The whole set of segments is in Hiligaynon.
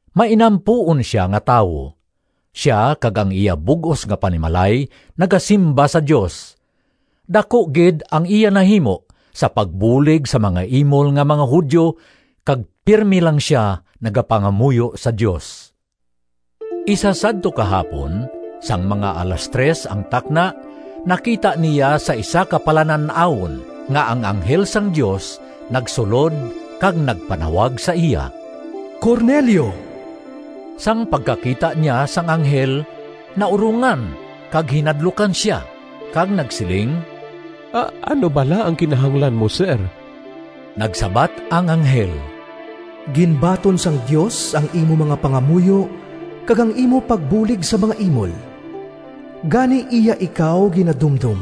Mainampuon sia nga tawo. Sia kag ang iya bug-os nga panimalay nagasimba sa Dios. Daku gid ang iya nahimo sa pagbulig sa mga imol nga mga Judio kag pirme lang sia nagapangamuyo sa Dios. Isa sadto ka hapon, sang mga alas tres ang takna, nakita niya sa isa ka palanan-awon nga ang anghel sang Dios nagsulod kag nagpanawag sa iya, “Cornelio!” Sang pagkakita niya sang anghel naurongan kag hinadlukan sia kag nagsiling, “Ano bala ang kinahanglan mo, sir?” Nagsabat ang anghel, “Ginbaton sang Dios ang imo mga pangamuyo kag ang imo pagbulig sa mga imol. Gani iya ikaw ginadumdom.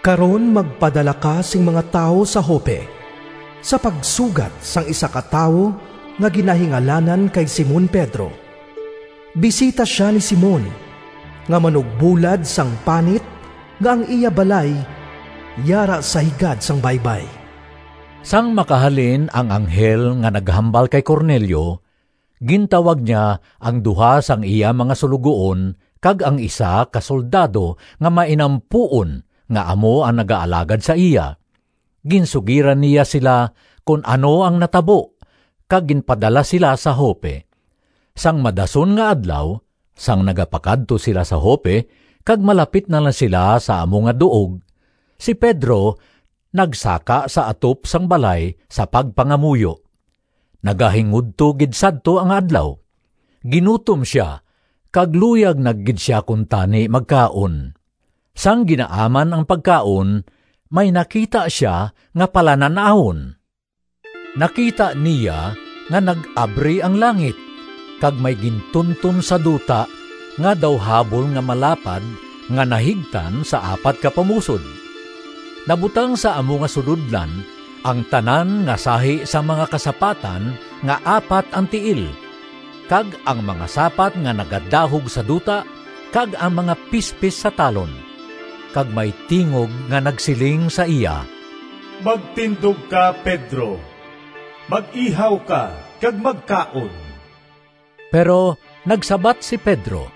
Karon magpadala ka sing mga tawo sa Joppe sa pagsugat sang isa ka tawo nga ginahingalanan kay Simon Pedro. Bisita sia ni Simon nga manugbulad sang panit nga ang iya balay yara sa higad sang baybay.” Sang makahalin ang anghel nga naghambal kay Cornelio, gintawag niya ang duha sang iya mga suloguon kag ang isa ka soldado nga mainampuon nga amo ang nagaalagad sa iya. Ginsugiran niya sila kon ano ang natabo, kag ginpadala sila sa Joppe. Sang madason nga adlaw sang nagapakadto sila sa Joppe kag malapit na lang sila sa amo nga duog, si Pedro nagsaka sa atop sang balay sa pagpangamuyo. Nagahingudto gid sadto ang adlaw. Ginutom sia kag luyag na gid sia kuntani magkaon. Sang ginaaman ang pagkaon, may nakita sia nga palanan-awon. Nakita niya nga nag-abri ang langit kag may gintunton sa duta nga daw habol nga malapad nga nahigtan sa apat ka pamusod. Nabutang sa amo nga sulodlan ang tanan nga sahi sang mga kasapatan nga apat ang tiil, kag ang mga sapat nga nagadahog sa duta kag ang mga pispis sa talon. Kag may tingog nga nagsiling sa iya, “Magtindog ka, Pedro! Mag-ihaw ka kag magkaon!” Pero nagsabat si Pedro,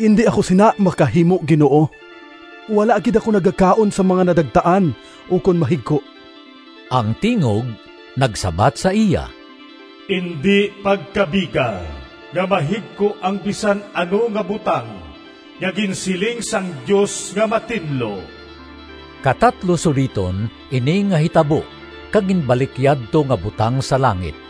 “Indi ako sina makahimo, Ginoo! Wala gid ako nagakaon sang mga nadagtaan ukon mahigko.” Ang tingog nagsabat sa iya, “Indi pagkabiga nga mahigko ang bisan ano nga butang nga ginsiling sang Dios nga matinlo.” Katatlo suliton ini nga hitabo kag ginbalik yadto nga butang sa langit.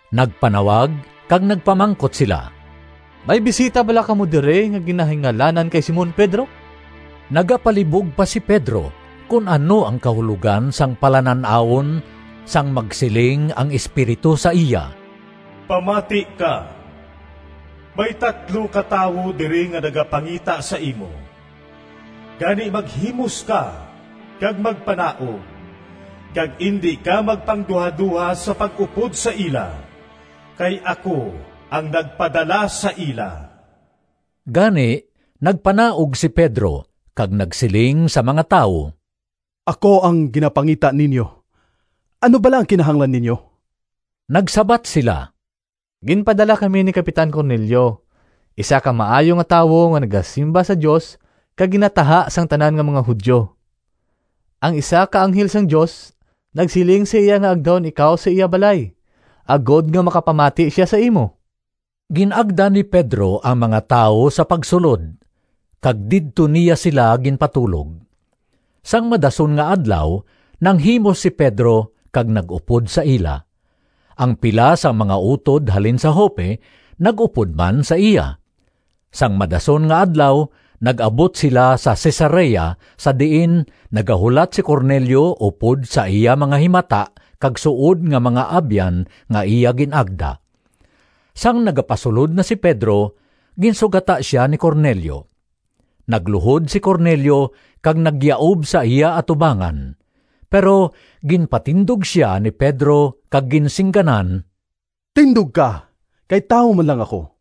Nagpanawag kag nagpamangkot sila, “May bisita bala kamo diri nga ginahingalanan kay Simon Pedro?” Nagapalibog pa si Pedro kon ano ang kahulogan sang palanan-awon sang magsiling ang Espiritu sa iya, “Pamati ka! May tatlo ka tawo diri nga nagapangita sa imo. Gani maghimos ka kag magpanaog kag indi ka magpangduhadoha sa pag-upod sa ila kay ako ang nagpadala sa ila.” Gani nagpanaog si Pedro kag nagsiling sa mga tawo, “Ako ang ginapangita ninyo. Ano bala ang kinahanglan ninyo?” Nagsabat sila, “Ginpadala kami ni Kapitan Cornelio, isa ka maayo nga tawo nga nagasimba sa Dios kag ginataha sang tanan nga mga Judio. Ang isa ka anghel sang Dios nagsiling sa iya nga agdahon ikaw sa iya balay agod nga makapamati sia sa imo.” Gin-agda ni Pedro ang mga tawo sa pagsulod, kag didto niya sila ginpatulog. Sang madason nga adlaw nanghimos si Pedro kag nag-upod sa ila. Ang pila sang mga utod halin sa Joppe nag-upod man sa iya. Sang madason nga adlaw nag-abot sila sa Cesarea sa diin nagahulat si Cornelio upod sa iya mga himata kag suod nga mga abyan nga iya gin-agda. Sang nagapasulod na si Pedro, ginsugata sia ni Cornelio. Nagluhod si Cornelio kag nagyaub sa iya atubangan. Pero ginpatindog sia ni Pedro kag ginsingganan, “Tindog ka, kay tawo man lang ako.”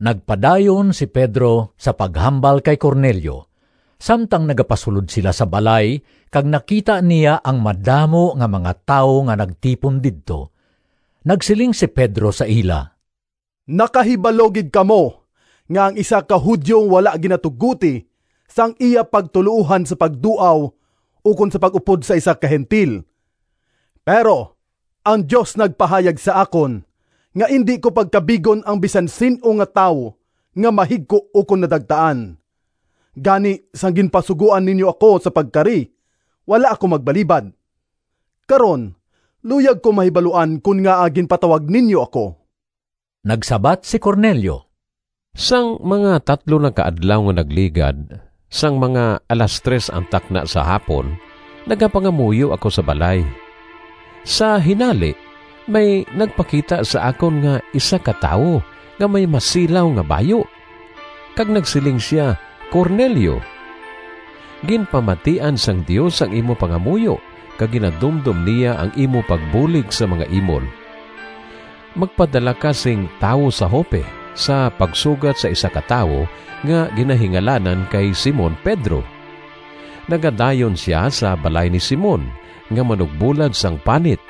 Nagpadayon si Pedro sa paghambal kay Cornelio, samtang nagapasulod sila sa balay kag nakita niya ang madamo nga mga tawo nga nagtipon didto. Nagsiling si Pedro sa ila, “Nakahibalo gid kamo nga ang isa ka Judio wala ginatugoti sang iya pagtuloohan sa pagduaw ukon sa pag-upod sa isa ka Gentil. Pero ang Dios nagpahayag sa akon, nga indi ko pagkabigon ang bisan sin-o nga tawo nga mahigko ukon nadagtaan. Gani sang ginpasugoan ninyo ako sa pagkari, wala ako magbalibad. Karon luyag ko mahibaluan kon ngaa ginpatawag ninyo ako.” Nagsabat si Cornelio, “Sang mga tatlo na ka adlaw nga nagligad, sang mga alas tres ang takna sa hapon, nagapangamuyo ako sa balay. Sa hinali may nagpakita sa akon nga isa ka tawo nga may masilaw nga bayu, kag nagsiling sia, ‘Cornelio! Ginpamatian sang Dios ang imo pangamuyo kag ginadumdom niya ang imo pagbulig sa mga imol. Magpadala ka sing tawo sa Joppe sa pagsugat sa isa ka tawo nga ginahingalanan kay Simon Pedro. Nagadayon sia sa balay ni Simon nga manugbulad sang panit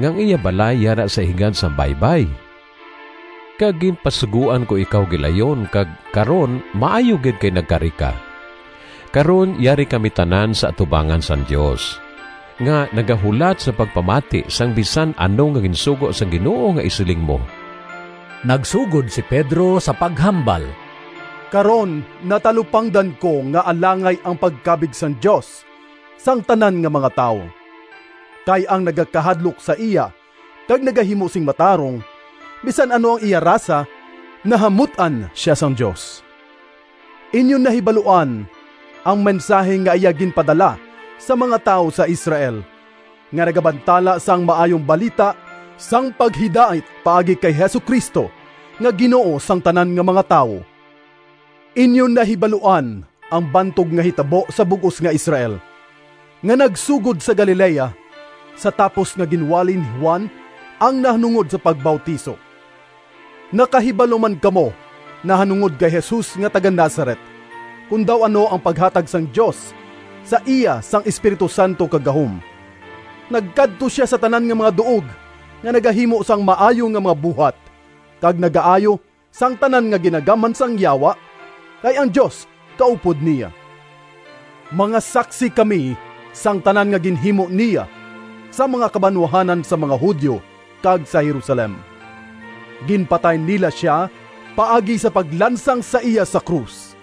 nga ang iya balay yara sa higad sang baybay.’ Kag ginpasugoan ko ikaw gilayon kag karon maayo gid kay nagkari ka. Karon yari kami tanan sa atubangan sang Dios, nga nagahulat sa pagpamati sang bisan ano nga ginsugo sang Ginoo nga isiling mo.” Nagsugod si Pedro sa paghambal, “Karon natalupangdan ko nga alangay ang pagkabig sang Dios sang tanan nga mga tawo. Kay ang nagakahadlok sa iya kag nagahimo sing matarong, bisan ano ang iya rasa, nahamut-an sia sang Dios. Inyo nahibaluan ang mensahi nga iya ginpadala sa mga tawo sa Israel, nga nagabantala sang Maayong Balita sang paghidait paagi kay Jesu-Cristo nga Ginoo sang tanan nga mga tawo. Inyo nahibaluan ang bantog nga hitabo sa bug-os nga Israel, nga nagsugod sa Galilea, sa tapos nga ginwali ni Juan ang nahanungod sa pagbautiso. Nakahibalo man kamo nahanungod kay Jesus nga taga-Nazaret, kon daw ano ang paghatag sang Dios sa iya sang Espiritu Santo kag gahom. Nagkadto sia sa tanan nga mga duog nga nagahimo sang maayo nga mga buhat kag nagaayo sang tanan nga ginagamhan sang Yawa, kay ang Dios kaupod niya. Mga saksi kami sang tanan nga ginhimo niya sa mga kabanwahanan sang mga Judio kag sa Jerusalem. Ginpatay nila sia paagi sa paglansang sa iya sa krus.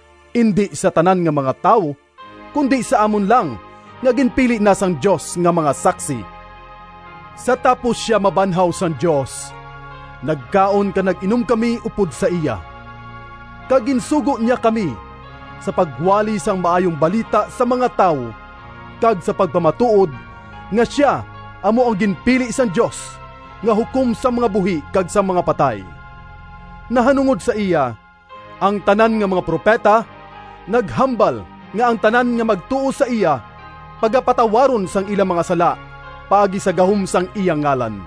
indi sa tanan nga mga tawo, kundi sa amon lang nga ginpili na sang Dios nga mga saksi. Sa tapos sia mabanhaw sang Dios, nagkaon kag nag-inom kami upod sa iya. Kag ginsugo niya kami sa pagwali sang Maayong Balita sa mga tawo kag sa pagpamatuod nga sia amo ang ginpili sang Dios nga hukom sang mga buhi kag sang mga patay. Nahanungod sa iya, ang tanan nga mga propeta naghambal nga ang tanan nga magtuo sa iya pagapatawaron sang ila mga sala paagi sa gahom sang iya ngalan.”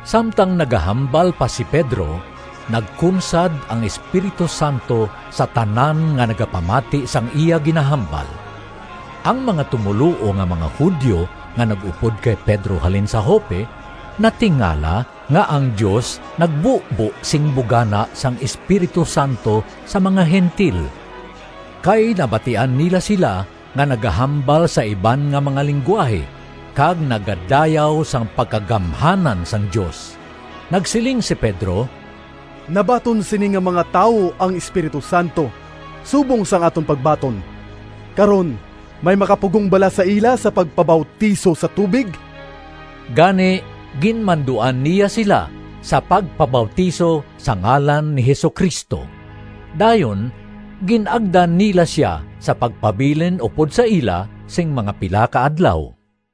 Samtang nagahambal pa si Pedro, nagkunsad ang Espiritu Santo sa tanan nga nagapamati sang iya ginahambal. Ang mga tumoluo nga mga Judio nga nag-upod kay Pedro halin sa Joppe natingala nga ang Dios nagbubo sing bugana sang Espiritu Santo sa mga Gentil. Kay nabatian nila sila nga nagahambal sa iban nga mga linggwahe kag nagadayaw sang pagkagamhanan sang Dios. Nagsiling si Pedro, “Nabaton sini nga mga tawo ang Espiritu Santo subong sang aton pagbaton. Karon may makapugong bala sa ila sa pagpabautiso sa tubig?” Gani ginmanduan niya sila sa pagpabautiso sa ngalan ni Jesu-Cristo. Dayon gin-agda nila sia sa pagpabilin upod sa ila sing mga pila ka adlaw.